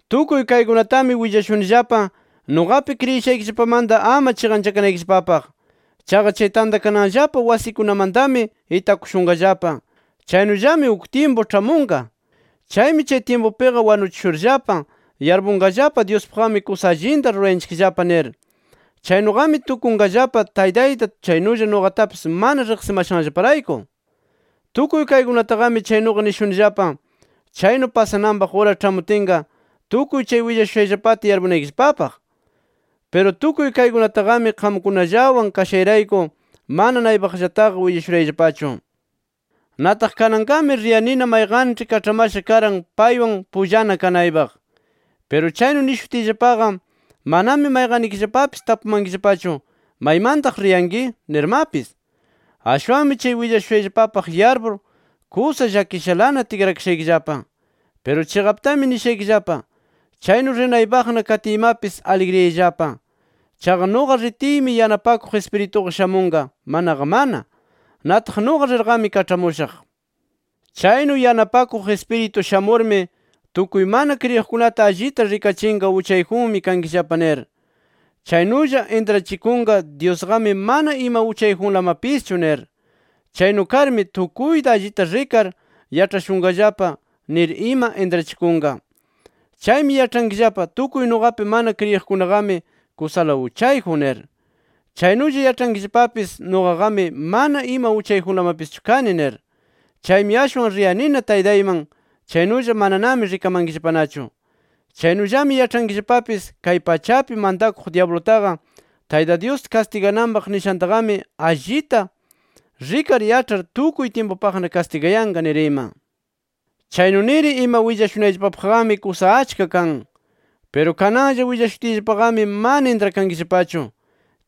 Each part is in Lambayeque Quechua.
“Tukuy kaykunatami willashunillapa, nuqapi kriyishaykillapamanta ama chiqanchakanaykillapapaq. Chaqa chay tantakananllapa wasikunamantami itakushunqallapa. Chaynullami uk tyimpu ĉhamunqa. Chaymi chay tyimpupiqa wanuchishurllapa, yarpunqallapa Dyuspaqqami kusa allinta rurayanchikllapa nir. Chaynuqami tukunqallapa Taytayta chaynulla nuqatapis mana riqsimashanllaparayku. Tukuy kaykunataqami chaynuqa nishunillapa, chaynu pasananpaq ura ĉhamutinqa, tukuy chay willashushayllapata yarpunaykillapapaq. “Piru tukuy kaykunataqami qamkunallawan kashayrayku mana naypaqllataqa willashurayllapachu. “Nataq kananqami riyanina mayqanĉhi kaĉhamasha karan paywan pullana kanaypaq. Piru chaynu nishutiyllapaqa manami mayqannikillapapis tapumankillapachu ¿maymantaq riyanki? nirmapis. Ashwanmi, chay willashushayllapapaq yarpur, kusa llakishalana tikrakashaykillapa. Piru chiqaptami nishaykillapa: Chaynu rinaypaqna katiymapis aligriyayllapa. Chaqa nuqa ritiymi Yanapakuq Ispirituqa shamunqa manaqa mana. Nataq nuqa rirqami kaĉhamushaq. Chaynu Yanapakuq Ispiritu shamurmi, tukuy mana kriyiqkunata allita rikachinqa uchayjunmi kankillapa nir. Chaynulla intrachikunqa Dyusqami mana ima uchayjunlamapischu nir. Chaynu karmi tukuyta allita rikar yaĉhashunqallapa nir ima intrachikunqa. Chaymi yaĉhankillapa, tukuy nuqapi mana kriyiqkunaqami kusala uchayjun nir. Chaynulla yaĉhankillapapis nuqaqami mana ima uchayjunlamapischu kani nir. Chaymi ashwan riyanina Taytayman, chaynulla mananami rikamankillapanachu. Chaynullami yaĉhankillapapis, kay pachapi mantakuq dyablutaqa, Tayta Dyus kastigakananpaq nishantaqami, allita rikar yaĉhar tukuy tyimpupaqna kastigayanqa nir ima. “Chaynu nir ima willashunayllapapaqmi kusa achka kan. Piru kananlla willashutiyllapaqami mana intrakankillapachu.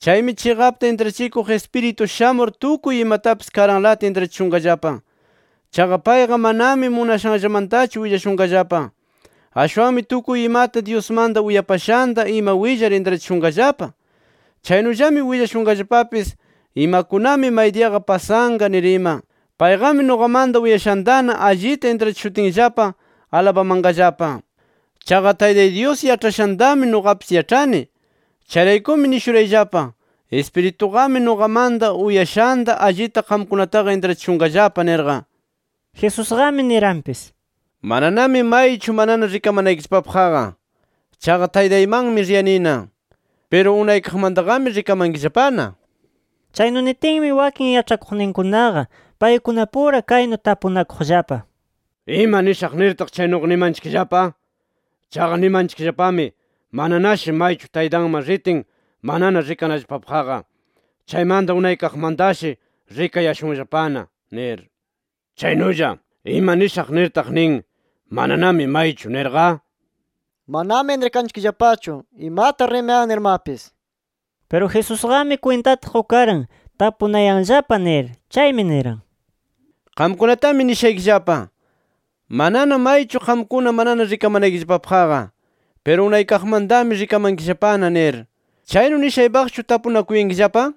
Chaymi Chiqapta intrachikuq Ispiritu shamur tukuy imatapis karanlata intrachishunqallapa. Chaqa payqa manami munashanllamantachu willashunqallapa. Ashwanmi tukuy imata Dyusmanta uyapashanta ima willar intrachishunqallapa. Chaynullami willashunqallapapis, imakunami maydiyaqa pasanqa nir ima. Payqami nuqamanta uyashantana allita intrachishutinllapa, alabamanqallapa. Chaqa Taytay Dyus yaĉhashantami nuqapis yaĉhani. Chayraykumi nishurayllapa: Ispirituqami nuqamanta uyashanta allita qamkunataqa intrachishunqallapa nirqa”. Jesusqami niranpis: “Mananami maychu manana rikamanaykillapapaqqa. [Chaqa Taytaymanmi riyanina.] Piru unaykaqmantaqami rikamankillapana” nir. Chaynu nitinmi, wakin yaĉhakuqninkunaqa paykunapura kaynu tapunakuqllapa: “¿Ima nishaq nirtaq, chaynuqa nimanchikllapa? Chaqa nimanchikllapami, mananashi maychu Taytanman ritin manana rikanallapapaqqa. Chaymanta unaykaqmantashi rikayashunllapana nir. Chaynulla, ¿ima nishaq nirtaq nin, ‘Mananami maychu’ nirqa? Manami intrakanchikllapachu imata rimayan nirmapis”. Piru Jesusqami kwintata qukaran, tapunayanllapa nir. Chaymi niran: —Qamkunatami nishaykillapa: Manana maychu qamkuna manana rikamanaykillapapaqqa. Piru unaykaqmantami rikamankillapana nir. ¿Chaynu nishaypaqchu tapunakuyankillapa?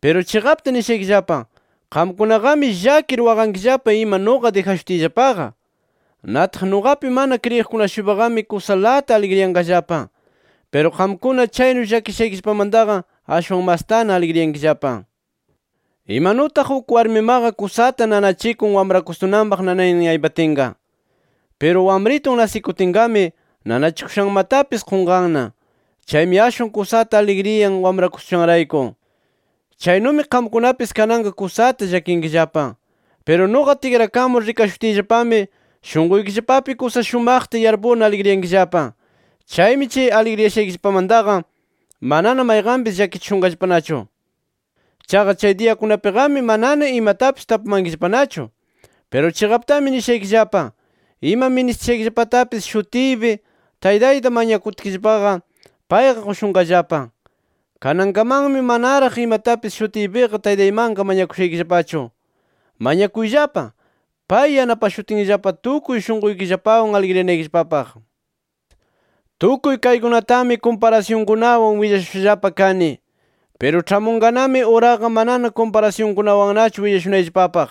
Piru chiqapta nishaykillapa: Qamkunaqami llakir waqankillapa ima nuqa dijashutiyllapaqa. Nataq nuqapi mana kriyiqkuna-shuypaqami kusalata aligriyanqallapa. Piru qamkuna chaynu llakishaykillapamantaqa ashwan mastana aligriyankillapa. Imanutaq uk warmimaqa, kusata nanachikun wamrakustunanpaq nanaynin aypatinqa. Piru wamritun nasikutinnaqami nanachikushanmatapis qunqanna. Chaymi ashwan kusata aligriyan, wamrakushanrayku. Chaynumi qamkunapis kananqa kusata llakinkillapa. Piru nuqa tikrakamur rikashutiyllapami, shunquykillapapi kusa shumaqta yarpurna aligriyankillapa. Chaymi chay aligriyashaykillapamantaqa manana mayqanpis llakichishunqallapanachu. “Chaqa chay diyakunapiqami manana imatapis tapumankillapanachu. Piru chiqaptami nishaykillapa: Ima ministishaykillapatapis shutiypi, Taytayta mañakutkillapa payqa qushunqallapa. Kanankamanmi manaraq imatapis shutiypiqa Taytaymanqa mañakushaykillapachu. Mañakuyllapa, pay yanapashutinllapa tukuy shunquykillapawan aligriyanaykillapapaq. “Tukuy kaykunatami, kumparasyunkunawan willashushallapa kani. Piru ĉhamunqanami uraqa manana kumparasyunkunawannachu willashunayllapapaq.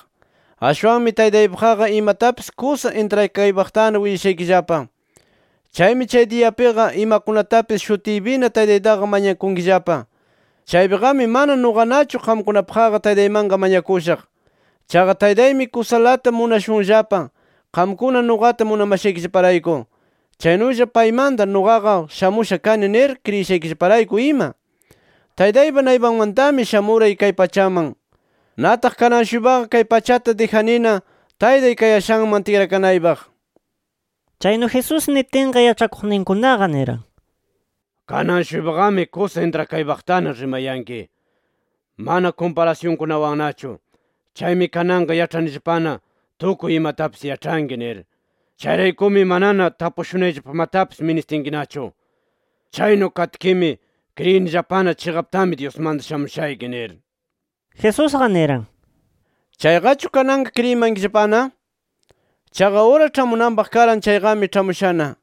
Ashwanmi Taytaypaqqa imatapis kusa intrakaypaqtana willashaykillapa. Chaymi chay diyapiqa, imakunatapis shutiypina Taytaytaqa mañakunkillapa. Chaypiqami mana nuqanachu qamkunapaqqa Taytaymanqa mañakushaq. Chaqa Taytaymi kusalata munashunllapa, qamkuna nuqata munamashaykillaparayku, chaynulla paymanta nuqaqa shamusha kani nir kriyishaykillaparayku ima. Taytaypa naypanmantami shamuray kay pachaman. Nataq kanan-shuypaqa kay pachata dijanina, Taytay kayashanman tikrakanaypaq”. Chaynu Jesús nitinqa, yaĉhakuqninkunaqa niran: —Kanan-shuypaqami kusa intrakaypaqtana rimayanki, mana kumparasyunkunawannachu. Chaymi kananqa yaĉhanillapana tukuy imatapis yaĉhanki nir. Chayraykumi manana tapushunayllapamatapis ministinkinachu. Chaynu katkimi, kriyinillapana chiqaptami Dyusmanta shamushayki nir. Jesusqa niran: —¿Chayqachu kananqa kriyimankillapana? Chaqa ura ĉhamunanpaq karan chayqami ĉhamushana.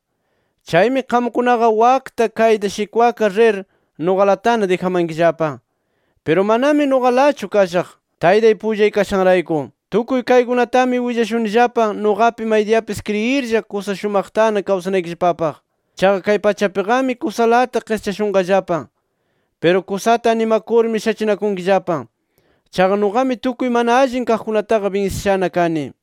Chaymi qamkunaqa wakta kayta shikwakar rir, nuqalatana dijamankillapa. Piru manami nuqalachu kashaq, Taytay pullay kashanrayku. Tukuy kaykunatami willashunillapa, nuqapi maydiyapis kriyirlla kusa shumaqtana kawsanaykillapapaq. Chaqa, kay pachapiqami kusalata qischashunqallapa. Piru kusata animakurmi shachinakunkillapa. Chaqa nuqami tukuy mana allin kaqkunataqa binsishana kani.